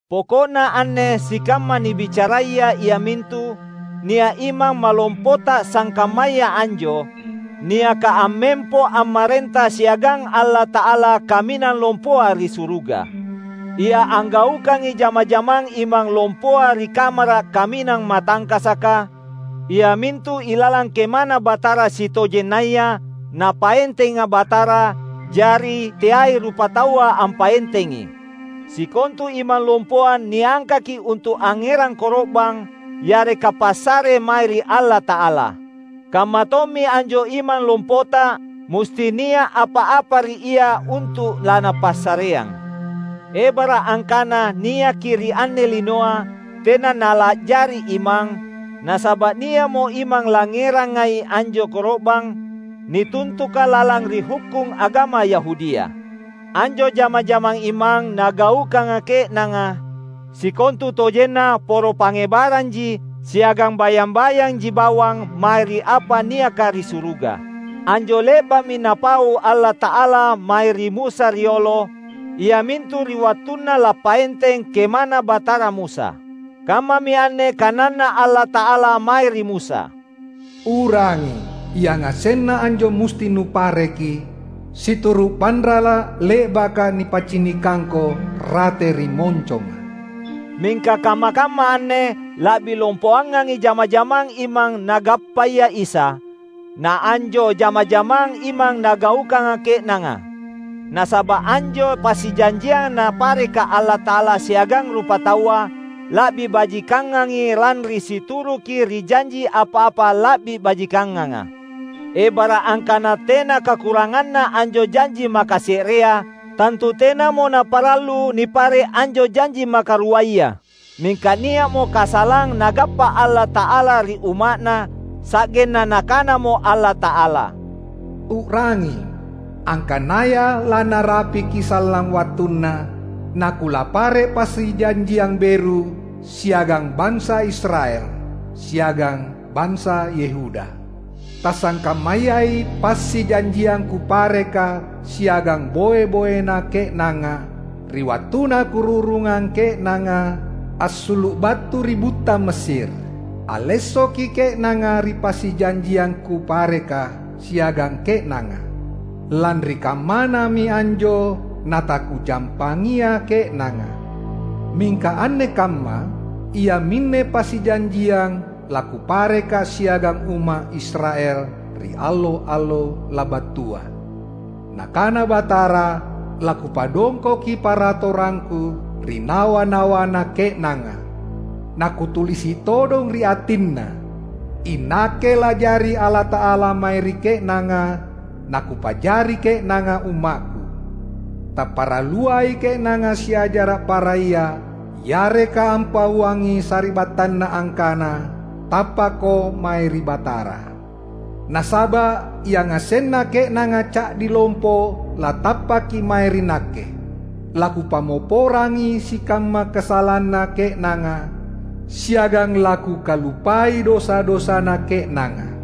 Poko’na anne sikamma nibicaraya iamintu: Nia’ Imang Malompota sangkammaya anjo; niaka ammempo ammarenta siagang Allata’ala Kaminang Lompoa ri suruga. Ia anggaukangi jama-jamang Imang Lompoa ri Kamara’ Kaminang Matangkasaka, iamintu ilalang KemaNa Batara sitojennaya, Napaentenga Batara, jari teai rupataua ampaentengi. Sikontu imang lompoa niangkaki untu’ angngerang koro’bang yareka passare mae ri Allata’ala. Kammatommi anjo Imang Lompota; musti nia’ apa-apa ri Ia untu’ laNapassareang. Ebara’ angkana niaki ri anne linoa, tena Nala’jari Imang, nasaba’ nia’mo imang langngerangai anjo koro’bang nituntuka lalang ri hukkung agama Yahudia. Anjo jama-jamang imang nagaukanga ke’nanga, sikontutojenna poro pangngebaranji siagang bayang-bayanji bawang mae ri apa niaka ri suruga. Anjo le’ba’mi Napau Allata’ala mae ri Musa riolo, iamintu ri wattunna lappaenteng KemaNa Batara Musa. Kammami anne kananNa Allata’ala mae ri Musa, "U’rangi! Yangasenna anjo musti nupareki situru’ panrala’ le’baka nipaccinikangko rate ri monconga." Mingka kamma-kamma anne la’bi lompoangangi jama-jamang imang Nagappaya Isa, naanjo jama-jamang imang nagaukanga ke’nanga. Nasaba’ anjo passijanjiang Napareka Allata’ala siagang rupataua la’bi bajikangangi lanri situruki ri janji apa-apa la’bi bajikanganga. Ebara’ angkana tena kakuranganna anjo janji makase’rea, tantu tenamo naparallu nipare’ anjo janji makaruaya. Mingka nia’mo kasalang Nagappa Allata’ala ri Umma’Na, sa’genna Nakanamo Allata’ala, "U’rangi, angkanaya lanarapiki sallang wattunna, naKulappare’ passijanjiang beru siagang bansa Israel, siagang bansa Yehuda. Tasangkammayai passijanjiang Kupareka siagang boe-boena ke’nanga ri wattunna Kururungang ke’nanga assulu’ battu ri butta Mesir. Allessoki ke’nanga ri passijanjiang Kupareka siagang ke’nanga, lanri kammanami anjo nataKujampangia ke’nanga. Mingka anne kamma, iaminne passijanjiang laKupareka siagang umma’ Israel ri allo-allo labattua, Nakana Batara: LaKupadongkoki paratorangKu ri nawa-nawanna ke’nanga, naKutulisi’ todong ri atinna. INakke la’jari Allata’ala mae ri ke’nanga, naKupa’jari ke’nanga UmmakKu. Taparalluai ke’nanga siajara’ para ia, yareka ampauangi sari’battanna angkana, ‘Tappakko mae ri Batara.’ Nasaba’ yangasenna ke’nanga ca’di lompo, latappaki mae ri Nakke. LaKupammopporangi sikamma kasalanna ke’nanga, siagang laKukaluppai dosa-dosana ke’nanga."